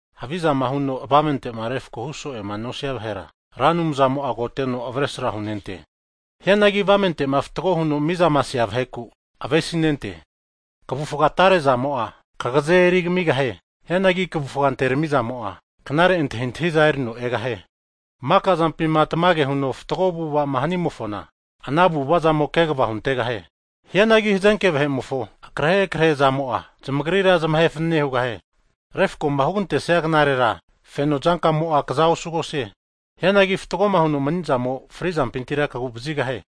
Havizama huno avamente'ma refkohu so'ema nosia vahera, Ra Anumzamo'a agoteno avesra hunente. Hianagi avamente'ma fatgo huno mizama asea vaheku avesinente. Kavufga atarezamo'a, kagaze'za erigamigahie. Hianagi kavufga anteramizamo'a, knare antahintahiza erino egahie. Maka zampima tamage huno fatgo avu'avama hanimofona, ana avu'avazamo kegva huntegahie. Hianagi hazenke vahe'mofo akrehe akrehe'zamo'a, zamagrira zamahe fanane hugahie. Refkoma hugantesia knarera, feno zankamo'a kaza osugosie. Hianagi fatgoma huno manizamo'a frizampintira kagu'vazigahie.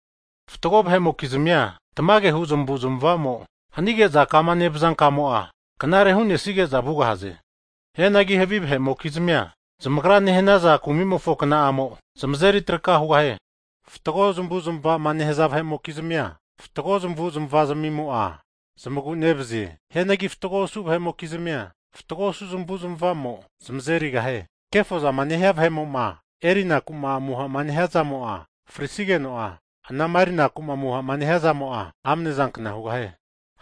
Fatgo vahe'mokizmia tamagehu zamavu zamavamo hanige'za, kama nevaza kamo'a, knare hu'nesige'za vugahaze. Hianagi havi vahe'mokizmia zamagra nehanaza kumimofo kna'amo, zamazeri traka hugahie. Fatgo zmavu' zmavama nehaza vahe'mokizmia, fatgo zmavu' zmava zmimo'a zamagu nevazie. Hianagi fatgo osu vahe'mokizmia fatgo osu zmavu' zmava zamo zmazerigahie. Kefozama nehia vahe' moma erinaku'ma amuhama nehia zamo'a frisigeno'a anama erinakuma amuhama nehiazamo'a, amane zankna hugahie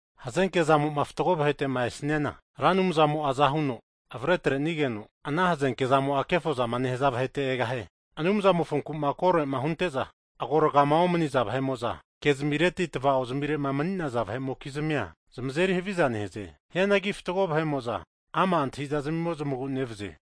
Hazenke zamo'ma fatgo vahete'ma esniana, Ra Anumzamo'a aza huno avare atrenigeno, ana hazenke zamo'a kefozama nehanaza vahete egahie. Anumzamofonku'ma korema hunte'za agorgama omaniza vahe'mo'za, kezmireti tava'ozmirema mani'namokizmia zamazeri haviza nehaze. Hianagi fatgo vahe'mo'za ama' antahiza zamimo zamagu nevazie.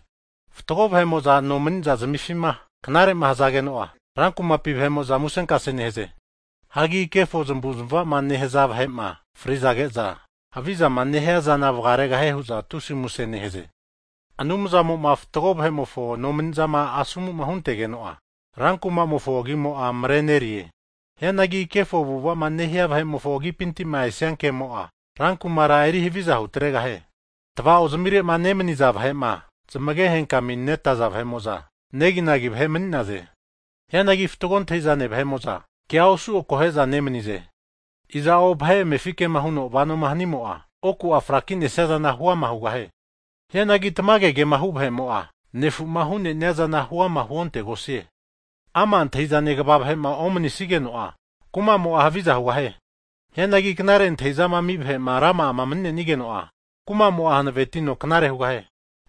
Fatgo vahe'mo'zama nomaniza zmifima knare hazageno'a, rankumapi vahe'mo'za musenkase nehaze. Hagi kefo zamavu zamavama nehaza vahe'ma fri'zage'za, havizama nehiazana vgaregahie hu'za tusi muse nehaze. Anumzamoma fatgo vahe'mofo nomanizama asomuma huntegeno'a, rankumamofo agimo'a marenerie. Hianagi kefo avu'avama nehia vahe'mofo agipintima esia kemo'a, rankumara eri haviza hutregahie. Tava'ozmirema nemaniza vahe'ma zamage henkaminetaza vahe'mo'za, neginagi vahe mani'naze. Hianagi fatgo antahizane vahe'mo'za, kea osu akohe'za nemanize. Iza'o vahe amefi kema huno vanoma hanimo'a, oku'a fraki'nesia zana hu'ama hugahie. Hianagi tamage kema hu vahe'mo'a, nefuma hu'nenia zana huama huontegosie. Ama' antahizane kva vahe'ma omanisigeno'a, kumamo'a haviza hugahie. Hianagi knare antahizama ami vahe'ma rama'ama mani'nenageno'a, kumamo'a hankvetino knare hugahie.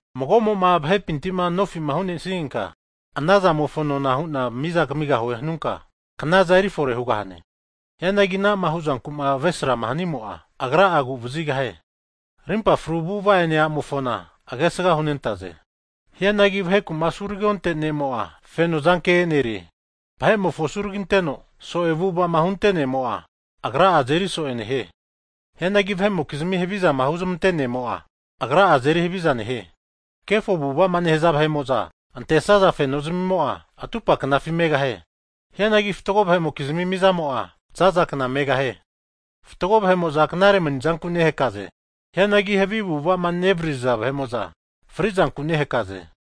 Mago'mo'ma vahepintima nofima hu'nesigenka, anazamofo nona huna miza kamigahue hunka hanunka, knaza erifore hugahane. Hianagi ana'ma hu'zankuma avesrama hanimo'a, agra'a aguvazigahie. Rimpa fru avu'ava ene a'mofona, agesga hunentaze. Hianagi vahekuma asuragionte ne'mo'a, feno zanke e'nerie. Vahe'mofo asuraginteno so'e avu'avama hunte ne'mo'a, agra'a azeri so'e nehie. Hianagi vahe'mokizmi havizama huzmantea ne'mo'a, agra'a azeri haviza nehie. Kefo avu'avama nehaza vahe'mo'za, antesaza feno zmimo'a atupa knafi megahie. Hianagi fatgo vahe'mokizmi mizamo'a, zaza kna megahie. Fatgo vahe'mo'za knare manizanku nehakaze. Hianagi havi avu'avazama nevaririza vahe'mo'za, frizanku nehakaze.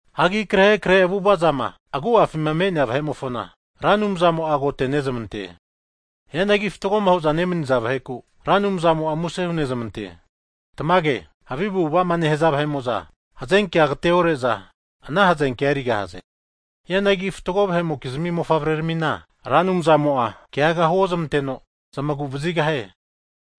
Hagi akrehe akrehe avu'avazama agu'afima me'nea vahe'mofona, Ra Anumzamo'a agotenezmante. Hianagi fatgoma hu'za nemaniza vaheku, Ra Anumzamo'a muse hunezmante Tamage, havi avu'avama nehaza vahe'mo'za hazenkea agateore'za, ana hazenkea erigahaze. Hianagi fatgo vahe'mokizmi mofavreramina, Ra Anumzamo'a keagaga huozmanteno zmagu'vazigahie.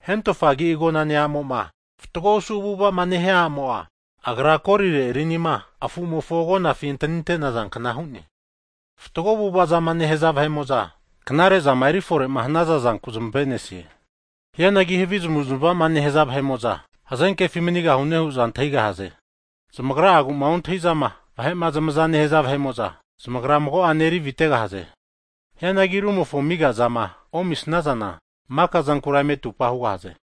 Hentofa agi agonane a'mo'ma fatgo osu avu'avama nehia a'mo'a, agra afu'mofo kolire tro hunte rinima agonafi antanintaza kna hu'ne. Fatgo avu'avama nehaza vahe'mo'za, knare'zama erifore'ma hanaza zanku zmave'nesie. Hianagi havi zamavu'zamavama nehaza vahe'mo'za hazenkefi manigahune hu'za antahigahaze. Zamagragu'ma ontahiza vahe'ma zamaza nehaza vahe'mo'za, zamagra mago'ane eri avitegahaze. Hianagi rumofo amiga zama omisnazana, maka zankura eme atupa hugahaze.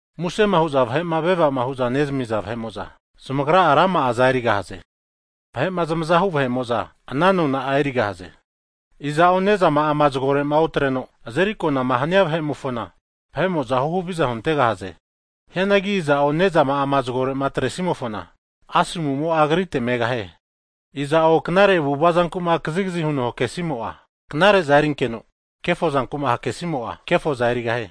Muse hu'za vahe'ma vevama nehaza vahe'mo'za, zmagra'a rama'aza erigahaze. Vahe'ma zmazahu vahe'mo'za, ana nona'a erigahaze. Iza'o nezama'ama zgore'ma otreno, azeri akonama hania vahe'mo'fona, vahe'mo'za huhaviza huntegahaze. Hianagi iza'o nezama'ama zgore'ma atresimofona, asomu'mo agritera megahie. Iza'o knare avu'ava zankuma kazigazi huno hakesimo'a, knare'za erinkeno, kefo zanku'ma hake'simo'a, kefoza erigahie.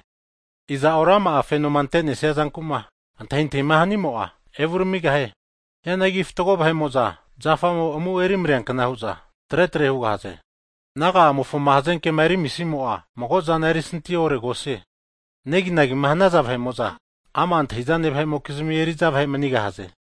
Iza'o rama'a fenoma ante'nesia zanku'ma antahintahima hanimo'a, evuramigahie. Hianagi fatgo vahe'mo'za zafamo amu eri mareankna hu'za, tre tre hugahaze. Naga'amofoma hazanke'ma erimisimo'a, mago'zana erisinti oharegosie. Neginagima hanaza vahe'mo'za ama' antahi'zane vahe'mokizmi eri'za vahe manigahaze.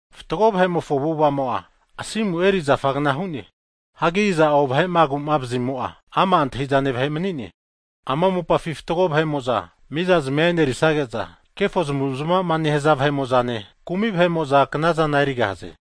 Fatgo vahe'mofo avu'avamo'a, asimu eri zafagna hu'ne. Hagi iza'o vahe'ma agu'mavazimo'a ama' antahi'zane vahe mani'ne. Ama mopafima fatgo vahe'mo'za miza zamia e'nerisage'za, kefo zamavu'zamavama nehanaza vahe'mo'zane, kumi vahe'mo'za knazana erigahaze.